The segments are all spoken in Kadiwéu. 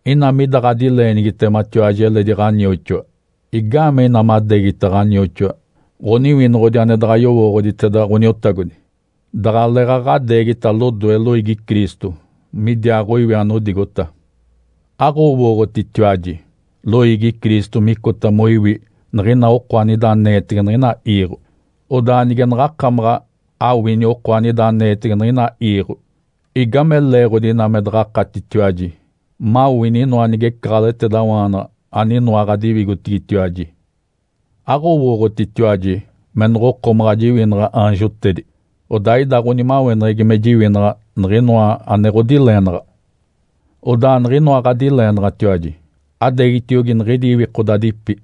Ina mida ɡ̶adileenigitematiwaji eledi ɡ̶anioxoa, igaamee ina madeegita ɡ̶anioxoa ɡ̶oniwinoɡ̶odi ane daɡ̶a yowooɡ̶oditeda Ǥoniotagodi? Daɡ̶aleeɡ̶aɡ̶a adeegita lodoe loiigi Cristo midiaaɡ̶oiwi anodigota. Aɡ̶owooɡ̶otitiwaji loiigi Cristo micota moiwi niɡ̶ina oko anida aneetege niɡ̶ina iiɡ̶o? Odaa nige naɡ̶akamaɡ̶a awini oko anida aneetege niɡ̶ina iiɡ̶o, igame leeɡ̶odi ina me daɡ̶akatitiwaji mawini inoa nigecaɡ̶aleɡ̶etedawaanaɡ̶a aninoa ɡ̶adiwigotigitiwaji? Aɡ̶owooɡ̶otitiwaji me noɡ̶okomaɡ̶a jiwinaɡ̶a aanjotedi? Odaa ida ɡ̶onimaweneɡ̶egi me jiwinaɡ̶a niɡ̶inoa ane ɡ̶odileenaɡ̶a. Odaa niɡ̶inoa ɡ̶adileenaɡ̶atiwaji, adeegitiogi niɡ̶idi iwikodadipi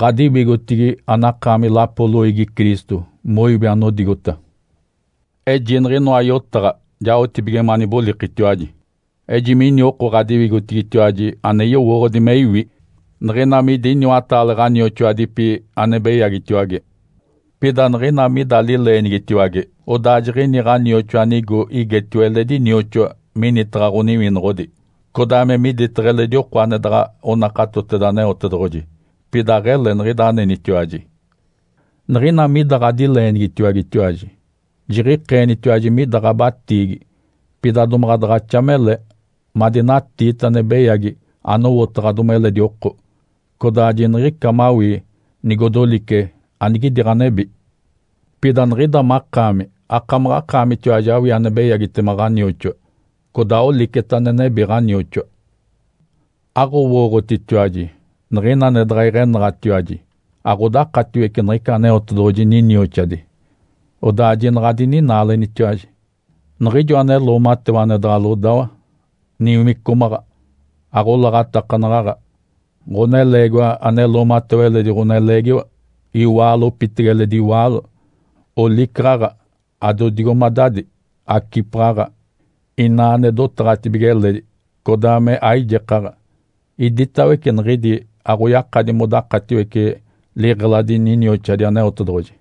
ɡ̶adiwigotigi anakaami lapo loiigi Cristo moiwi anodigota. Eji niɡ̶inoa yotaɡ̶a jaotibige manibolikitiwaji. Ejimini oko ɡ̶adiwigotigitiwaji ane yowooɡ̶odi me iwi niɡ̶ina midi iniwataale ɡ̶anioxoadipi ane beyagitiwage. Pida niɡ̶ina mida lileenigitiwage, odaa jiɡ̶ini ɡ̶anioxoa anigo igetio eledi nioxoa minitaɡ̶a ɡ̶oniwinoɡ̶odi, codaa me miditaɡ̶a eledi oko ane daɡ̶a onakatoteda Aneotedoɡ̶oji. Pida aɡ̶ele niɡ̶ida anenitiwaji. Niɡ̶ina mida ɡ̶adileenigitiwagetiwaji, jiɡ̶ikeenitiwaji mida ɡ̶abatiigi. Pida domaɡ̶a daɡ̶axa mele madinatiita ane beyagi anowotaɡ̶adomi eledi oko, codaa jiniɡ̶ica mawii nigodolice anigidi ɡ̶anebi. Pida niɡ̶ida makaami akamaɡ̶akaamitiwaji awii ane beyagitema ɡ̶anioxoa, codaa oliceta ane nebi ɡ̶anioxoa. Aɡ̶owooɡ̶otitiwaji niɡ̶ina ane daɡ̶a iɡ̶enaɡ̶atiwaji aɡ̶odakatiwece niɡ̶ica Aneotedoɡ̶oji ninioxadi? Odaa jinaɡ̶a adininaalenitiwaji! Niɡ̶ijo ane loomatewa ane daɡ̶a lodawa, niwicomaɡ̶a, aɡ̶olaɡ̶atakanaɡ̶aɡ̶a, ɡ̶oneleegiwa ane loomatewa eledi ɡ̶oneleegiwa, iwaalo opitege eledi iwaalo, olicaɡ̶aɡ̶a, adodigomadadi, acipaɡ̶aɡ̶a, ina ane dotaɡ̶atibige eledi, codaa me aijekaɡ̶a, iditawece niɡ̶idi aɡ̶oyakadi modakatiwece liɡ̶eladi ninioxadi Aneotedoɡ̶oji.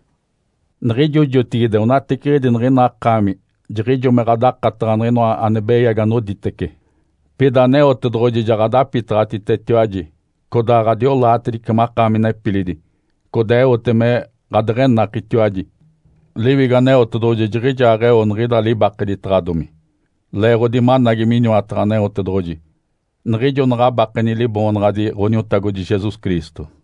Niɡ̶ijo jotigide onateciɡ̶idi niɡ̶ina akaami jiɡ̶ijo me ɡ̶adakataɡ̶a niɡ̶inoa ane beyagi anoditece. Pida Aneotedoɡ̶oji ja ɡ̶adapitaɡ̶atitetiwaji, codaa ɡ̶adiolaatedice makaami nepilidi, codaa eote me ɡ̶adeɡ̶enakitiwaji. Liwigo Aneotedoɡ̶oji jiɡ̶ijaaɡ̶eo niɡ̶ida libakeditaɡ̶adomi, leeɡ̶odi managi miniwataɡ̶a Aneotedoɡ̶oji niɡ̶ijo naɡ̶abakeni Liboonaɡ̶adi Ǥoniotagodi Jesus Cristo.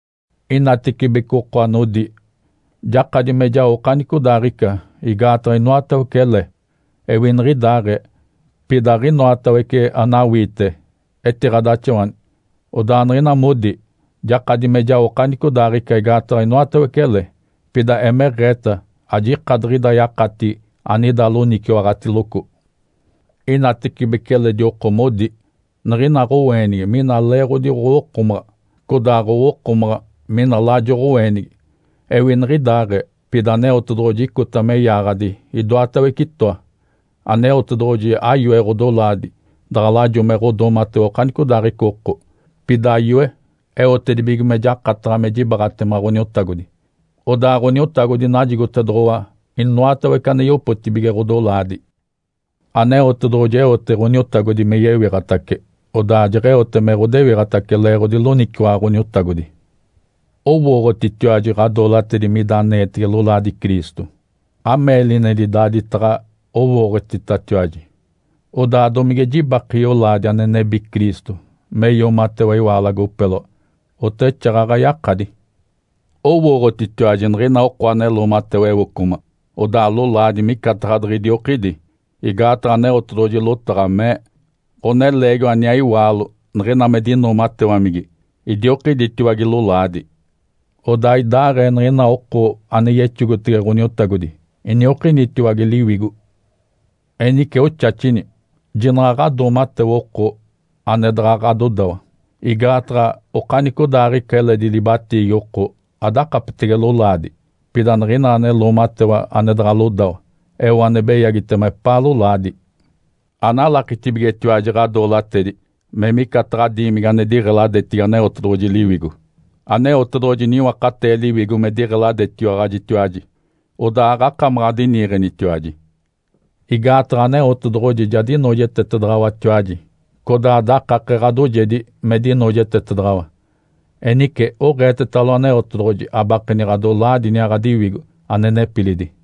Inatecibece oko anodi, “Jakadi me jao okanicodaaɡ̶ica, igaataɡ̶a inoatawece ele.” Ewi niɡ̶idaaɡ̶ee, pida aɡ̶inoatawece anawiite etiɡ̶adaxawani. Odaa niɡ̶ina modi, “Jakadi me jao okanicodaaɡ̶ica, igaataɡ̶a inoatawece ele.” Pida emeɡ̶eeta ajika diɡ̶ida yakatigi anida loniciwaɡ̶atiloco. Inatecibece eledi oko modi, “Niɡ̶ina ɡ̶oweenigi mina leeɡ̶odi ɡ̶owokomaɡ̶a, codaa ɡ̶owokomaɡ̶a mini lajo ɡ̶oweenigi.” Ewi niɡ̶idaaɡ̶ee, pida Aneotedoɡ̶oji icota me yaaɡ̶adi idoatawece itoa. Aneotedoɡ̶oji ayoe ɡ̶odolaadi daɡ̶a lajo me ɡ̶odoomatewa okanicodaaɡ̶ica oko, pida yoe eotedibige me jakataɡ̶a me jibaaɡ̶atema Ǥoniotagodi. Odaa Ǥoniotagodi najigotedoɡ̶owa inoatawece ane yopotibige ɡ̶odolaadi. Aneotedoɡ̶oji eote Ǥoniotagodi me yewiɡ̶atace, odaa jeɡ̶eote me ɡ̶odewiɡ̶atace leeɡ̶odi loniciwaɡ̶a Ǥoniotagodi. Owooɡ̶otitiwaji ɡ̶adoolatedi mida aneetege lolaadi Cristo? Ameelinedi daaditaɡ̶a owooɡ̶otitatiwaji! Odaa domige jibake yolaadi ane nebi Cristo me yoomatewa iwaalo agopeloa? Oteɡ̶exaaɡ̶aɡ̶a yakadi! Owooɡ̶otitiwaji niɡ̶ina oko ane loomatewa ewocoma, odaa lolaadi micataɡ̶a diɡ̶idiokidi? Igaataɡ̶a Aneotedoɡ̶oji lotaɡ̶a mee, “Ǥoneleegiwa aniaa iwaalo niɡ̶ina me dinoomatewamigi idiokiditiwage lolaadi.” Odaa idaaɡ̶ee niɡ̶ina oko ane yexogotege Ǥoniotagodi iniokinitiwage liwigo. Enice oxaxini, jinaɡ̶a ɡ̶adoomatewa oko ane daɡ̶a ɡ̶adodawa. Igaataɡ̶a okanicodaaɡ̶ica eledi libatiigi oko adakapetege lolaadi. Pida niɡ̶ina ane loomatewa ane daɡ̶a lodawa eo ane beyagitema epaa lolaadi. Analakitibigetiwaji ɡ̶adoolatedi me micataɡ̶a diimigi ane diɡ̶eladetigi Aneotedoɡ̶oji Liwigo? Aneotedoɡ̶oji niwakatee Liwigo me diɡ̶eladetiwaɡ̶ajitiwaji. Odaa aɡ̶akamaɡ̶a adiniiɡ̶enitiwaji. Igaataɡ̶a Aneotedoɡ̶oji ja dinoojetetedaɡ̶awatiwaji, codaa dakake ɡ̶adoojedi me dinoojetetedaɡ̶awa. Enice oɡ̶eetetalo Aneotedoɡ̶oji abakeni ɡ̶adolaadi iniaa ɡ̶adiwigo, ane nepilidi.